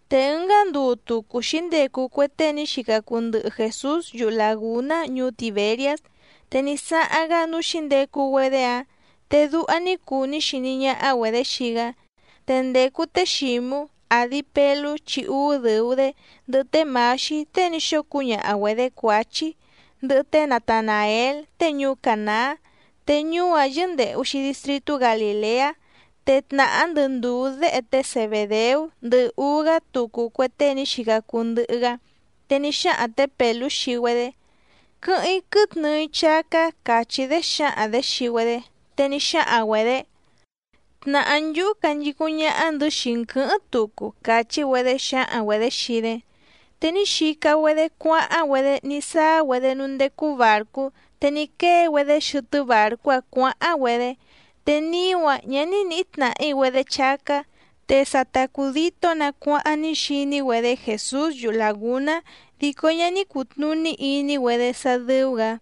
Te ɨngá nduu tucu xǐndecu cue tée ní xica cuu ndɨhɨ Jèsús yuhu làgúná ñuú Tìberiás, te ní sáháⁿ‑gá núú xǐndecu‑güedé‑áⁿ. Te duha ní cuu ní xiní ñáhá‑güedě xii‑gá. Te ndècu té Xǐmú, àdi Pelú chi úú dɨ̀u‑dé, ndɨhɨ té Mǎxí tée ní xóo cúñaha‑güedě Cuǎchí, ndɨhɨ té Natanàél tée ñuú Cànaá, te ñuú‑áⁿ yɨ́ndèhu‑xi distritú Galìleá, te tnàhá ndɨ ndùú déhe té Zebèdeú, ndɨhɨ úú‑gá tucu cue tée ní xica cuu ndɨhɨ‑gá. Te ní xáhaⁿ tě Pèlú xii‑güedé: —Quɨ́hɨ́ⁿ‑í quɨ́tnɨɨ‑í chácá —càchí‑dé xǎhaⁿ‑dě xii‑güedé. Te ní xáhaⁿ‑güedě: —Tnàhá nchúhú canchicúⁿ ñáhá‑ndɨ̌ xii‑n quɨ̌hɨ́ⁿ tucu —càchí‑güedé xǎhaⁿ‑güedě xii‑dé. Te ní xica‑güedé cuáháⁿ‑güedé ní sáá‑güedé núú ndécú bàrcú, te ní quée‑güedé xɨtɨ́ bàrcú‑áⁿ cuǎháⁿ‑güedé. Te niú‑áⁿ ñǎ ní nǐhí tnàhí‑güedé chácá. Te sa ta cùditó‑nǎ cuáháⁿ ní xiní‑güedé Jèsús yuhu làgúná, dico ñá ní cùtnuní iní‑güedé sá dɨ́ú‑gǎ.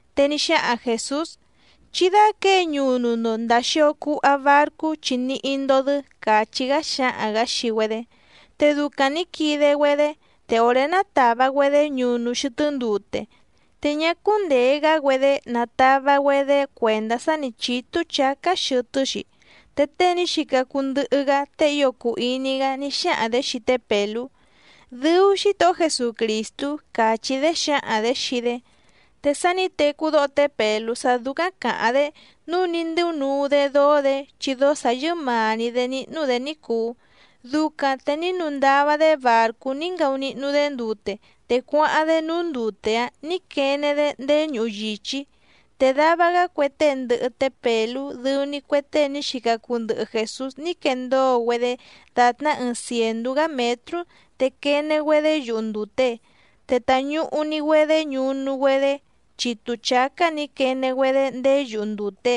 Te ní xáhaⁿ Jèsús: —Chí dáquěe ñunu‑ndo ndàa xio cuha barcú chi níhí‑ndó‑dɨ́ —càchí‑gá xáhaⁿ‑gǎ xii‑güedé. Te ducaⁿ nǐ quide‑güedé, te òré nátàva‑güedé ñunu xɨtɨ́ ndute, te ñá cúndèe‑gá‑güedé natava‑güedé cuèndá sá nǐ chítú chǎcá xɨtɨ́‑xi. Te tée ní xica cuu ndɨhɨ‑gá tée ío cùu iní‑gá ní xáhaⁿ‑dě xii té Pèlú: —¡Dɨu Xítohó Jesucrìstú! —càchí‑dé xǎhaⁿ‑dě xii‑dé. Te sá nǐ tecú dóho té Pèlú sá dúcáⁿ càháⁿ‑dé nǔu ní ndɨ́únuu‑dé dóó‑dě, chi dóó sǎ yɨ́màa‑ni‑dé níhnú‑dě ní cùu. Ducaⁿ te ní nuu ndava‑dé bàrcú ní ngaunihnu‑dé ndute, te cuáháⁿ‑dé núú ndute‑áⁿ nǐ quene‑dé ndéé ñuhu yìchí. Te dava‑gá cue tée ndɨhɨ té Pèlú dɨu‑ni cue tée ní xica cuu ndɨhɨ Jèsús ní quendóo‑güedé dàtná ɨɨⁿ cièndú‑gá mětrú te quene‑güedé yuhu ndùte. Te tàñuhu‑ni‑güedé ñunu‑güedé chitu chǎcá nǐ quene‑güedé ndéé yuhu ndùte.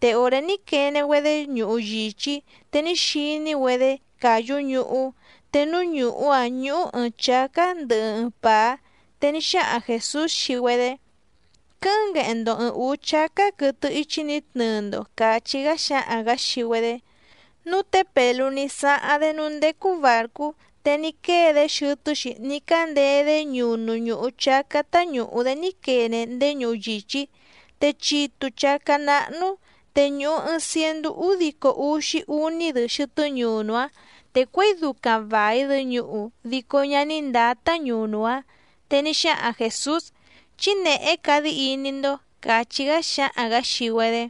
Te òré ní quene‑güedé ñuhu yìchí, te ní xiní‑güedé càyú ñuhú, te núú ñùhú‑áⁿ ñúhú ɨ̀ɨⁿ chácá ndɨhɨ ɨɨⁿ pàá. Te ní xáhaⁿ Jèsús xii‑güedé: —Quɨ́hɨ́ⁿ ngueheⁿ‑ndo ɨ̀ɨⁿ úú chácá quɨtɨ íchí nǐ tnɨɨ‑ndo —càchí‑gá xáhaⁿ‑gǎ xii‑güedé. Núu té Pèlú ní sáháⁿ‑dé núú ndécú bàrcú, te ní quée‑dé xɨtɨ́‑xi ní cándeé‑dé ñunu ñùhu chácá táñùhu‑dé ní quene ndéé ñuhu yìchí, te chitu chǎcá náhnú, te ñùhu ɨɨⁿ ciendú údico úxí úní‑dɨ xɨtɨ́ ñunu‑áⁿ, te cuěi ducaⁿ vài‑dɨ ñuhu dico ñá ní ndǎtá ñunu‑áⁿ. Te ní xáhaⁿ Jèsús: —Chí nèhé cadí iní‑ndó —càchí‑gá xáhaⁿ‑gǎ xii‑güedé.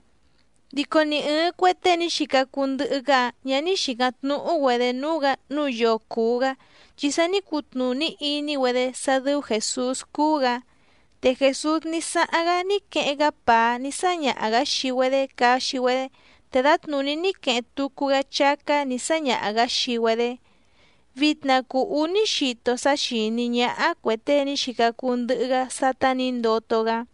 Dico ni ɨ̀ɨⁿ cue tée ní xica cuu ndɨhɨ‑gá‑áⁿ ñǎ ní xìcáⁿ tnúhú‑güedě núú‑gǎ nǔu yoo cùu‑gá, chi sa ní cutnùní iní‑güedé sá dɨ́ú Jèsús cúú‑gǎ. Te Jèsús ní sáháⁿ‑gá ní queheⁿ‑gá pàá ní sáñaha‑gǎ xii‑güedé caxi‑güedé, te dǎtnùní ní queheⁿ tucu‑gá chácá nǐ sáñaha‑gǎ xii‑güedé. Vitna cùu úní xito sá xìní ñáhá cue tée ní xica cuu ndɨhɨ‑gá sátá nǐ ndoto‑gá.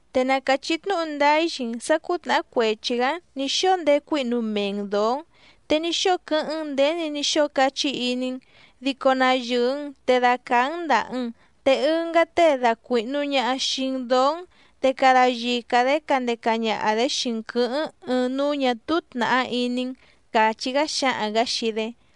Te na càchí tnúhu ndáá‑í xii‑n sǎ cǔtnàhá cuechi‑gǎ‑n nǐ xóo ndécuǐhnu mee‑n dǒó‑n, te ní xóo quɨ́hɨ́ⁿ‑n nděni ní xóo cachí iní‑n, dico na yɨ̀ɨ‑n te dacàá‑n ndàha‑n, te ɨngá tée dacuìhnu ñaha xii‑n dóó‑n te cada yica‑dě candeca ñaha‑dě xii‑n quɨ̌hɨ́ⁿ ɨɨⁿ núú ñà túú tnàhá iní‑n —càchí‑gá xáhaⁿ‑gǎ xii‑dé.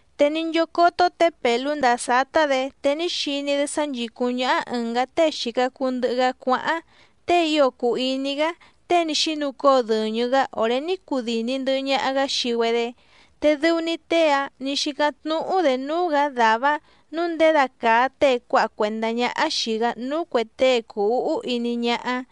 Te ní nchócótó tě Pèlú ndàa sátá‑dě, te ní xiní‑dé sá nchìcúⁿ ñáhá ɨ̀ngá tée xìca cuu ndɨhɨ‑gá cuáháⁿ, tée ío cùu iní‑gá tée ní xínucóo dɨ̀ñɨ‑gá òré ní cudìni ndɨhɨ ñaha‑gá xii‑güedé, te dɨu‑ni tée‑áⁿ nǐ xícáⁿ tnúhú‑dě núú‑gǎ dàvá‑áⁿ nǔu nděda càa tée cuáha cuèndá ñáhá xìi‑gá núú cuè tée cùu úhú iní ñáhá.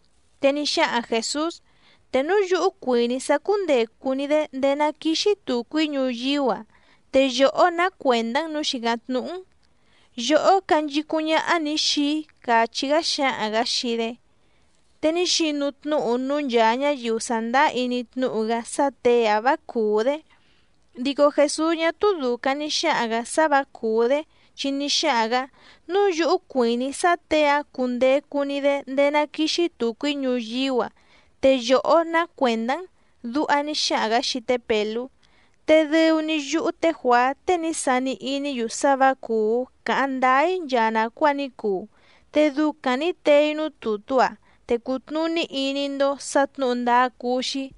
Te ní xáhaⁿ Jèsús: —Te núu yúhú cuìní‑í sá cúndècu‑ni‑dé ndéé ná quìxi tucu‑í ñuyíú‑a, ¿te yòhó ná cuèndá‑n nǔu xìcáⁿ tnúhú‑n? Yòhó canchicúⁿ ñáhá‑ní xìi‑í —càchí‑gá xáhaⁿ‑gǎ xii‑dé. Te ní xinu tnúhu núú nchàa ñáyiu sàndáá iní tnúhu‑gá sá těe‑ǎⁿ vǎ cùú‑dé. Dico Jèsús ñá túú dùcaⁿ ní xáhaⁿ‑gǎ sá vǎ cùú‑dé, chi ní xáhaⁿ‑gǎ: “Núu yúhú cuìní‑í sá těe‑ǎⁿ cundecu‑ni‑dé ndéé ná quìxi tucu‑í ñuyíú‑a, ¿te yòhó ná cuèndá‑n?”, duha ní xáhaⁿ‑gǎ xii té Pèlú. Te dɨu‑ni yúhú té Juàá tée ní sani iní‑yu sá vǎ cùú càháⁿ ndáá‑í nchaa nàcuáa ní cuu, te ducaⁿ nǐ tee‑í núú tùtú‑a, te cùtnuní iní‑ndó sǎ tnǔhu ndáá cúú‑xí.